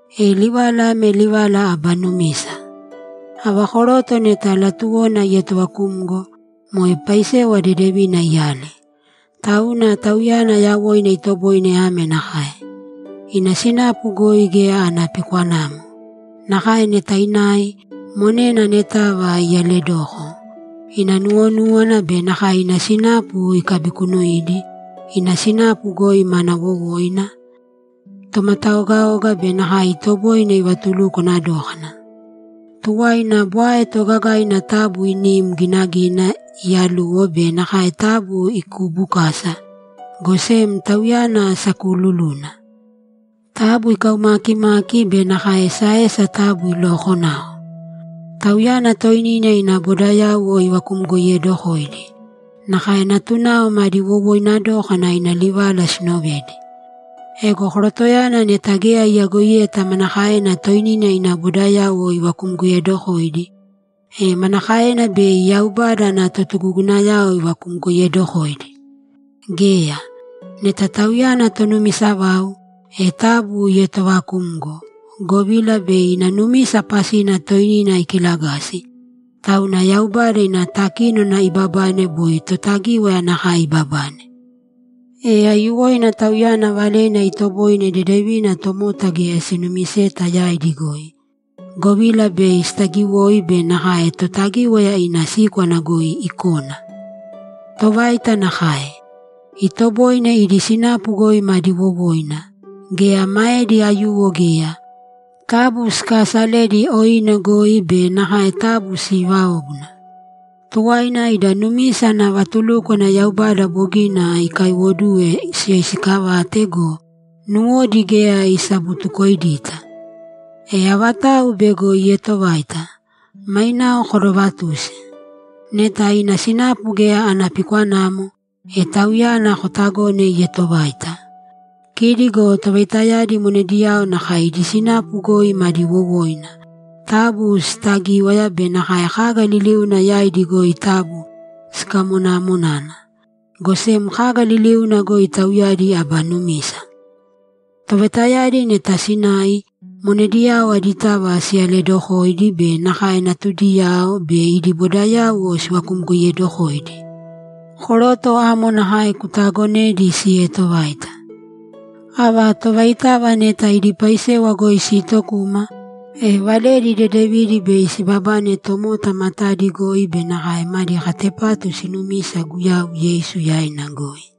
E livala ame livala aba numisa: Ava koroto neta latuwona ietovakumgo, moe paisewa dedevina iyale. Tauna tauyana yawoina itoboine ame nakae: Ina sinapu goi geya ana pikwanamo. Nakae neta inai, monena anetava iyaledoko. Ina nuwonúwana be nakae ina sinapu ikabikunuidi, ina sinapu goi mana wowoina, tomataogaoga be nakae itoboine ivatulukwana dókana. Tuwaina bwae toogagaina taabu inim ginagīna iyaluwo be nakae taabu ikuubukāsa, go sem tauyana sakuululuna. Taabu ikaumaakimāki be nakae esaesa taabu ilookonāko. Tauyana toinina ina bodayauwo ivakumgoiyedokōidi, nakae natunao madi wowoina dókana ina livala sinovedi. Ego korotoyana neta geya iyagoiyeta manakaena toinina ina bodayauwo ivakumgoiyedokoidi, e manakaena bei Yaubada ana totugugunayao ivakumgoiyedokoidi? Geya. Neta tauyana tonumisa vau, e taabu ietoovakūmgo, govila bei ina numisa pasina toinina ikilagasi, tauna Yaubada ina takínona ibabane boi Totagíwaya nakae ibabane. E aiyuwoina tauyana valena itoboine dedevina tomota geya sinumiseta yaidi goi, govila bei sitagiwoi be nakae Totagíwaya ina síkwana goi ikona. Tovaita nakae. Itoboine idi sinapu goi madi wowoina, geya maedi aiyuwo geya, taabu sikaasalēdi oine goi be nakae taabu siivāobuna. Tuwaina ida numisa ana vatulúkwana Yaubada bogina ikaaiwoduwe siyoisiikavāte go, nuwodi geya isabutukoidita. E avatau bego ietovaita, mainao kodovatūsi. Neta ina sinapu geya ana pikwanamo, e tauyana kotagōne ietovaita. Kidi go tovaitayadi monediyao nakae idi sinapu goi madi wowoina, taabu siitagīwaya be nakae kaga liliuna yaidi goi taabu sikamonaamonāna. Go sem kaga liliuna goi tauyadi aba numisa. Tovaitayadi neta sinai, monediyao aditava siyaledokōidi be nakae natudiyao be idi bodayauwo sivakumgoiyedokōidi. Koroto amo nakae kutaagonēdi sieetovaita. Ava tovaitava neta idi paisewa goi siitokuma, e valedi dedevidi bei sibabane tomota matadi goi be nakae madi katepatu sinumisa Guyau Yeisu yaina goi.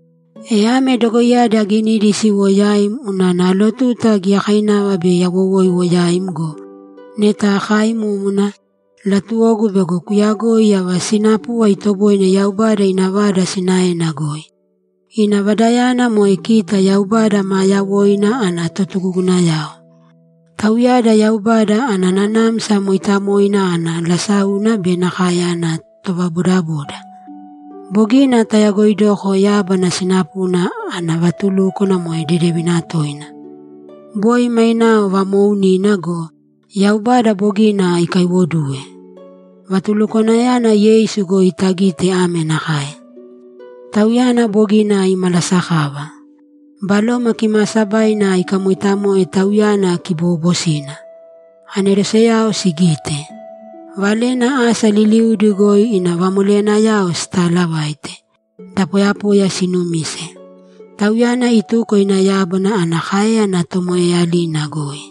E ame dogoiyadi aginidi siwo yaim unana alotuta giyakainava bei awowoiwo yaim go, neta akaaimúmuna, latuwogu bego kuuyagoi ava sinapuva itoboine Yaubada ina vada sinaena goi. Ina vadayana moe kita Yaubada maa yawoina ana totugugunayao. Tauyada Yaubada ana Nanamsa Mooitamoina ana lasáuna be nakae ana tovabodaboda. Bogina tayagoidoko yábana sinapuna ana vatulúkwana moe dedevina toina! Boi mainao vamoounina go, Yaubada bogina ikaiwoduwe. Vatulukwanayana Yeisu goi tagite ame nakae: Tauyana bogina imalasakava. Baloma Kimaasabaina ikamoitamoe Tauyana kiboobosina. Aneroseyao sigite. Valena asa liliudi goi ina vamoleyanayao sitalavaite. Da poyapoya sinumise. Tauyana ituko ina Yaubada ana káeyana tomoeeyalina goi.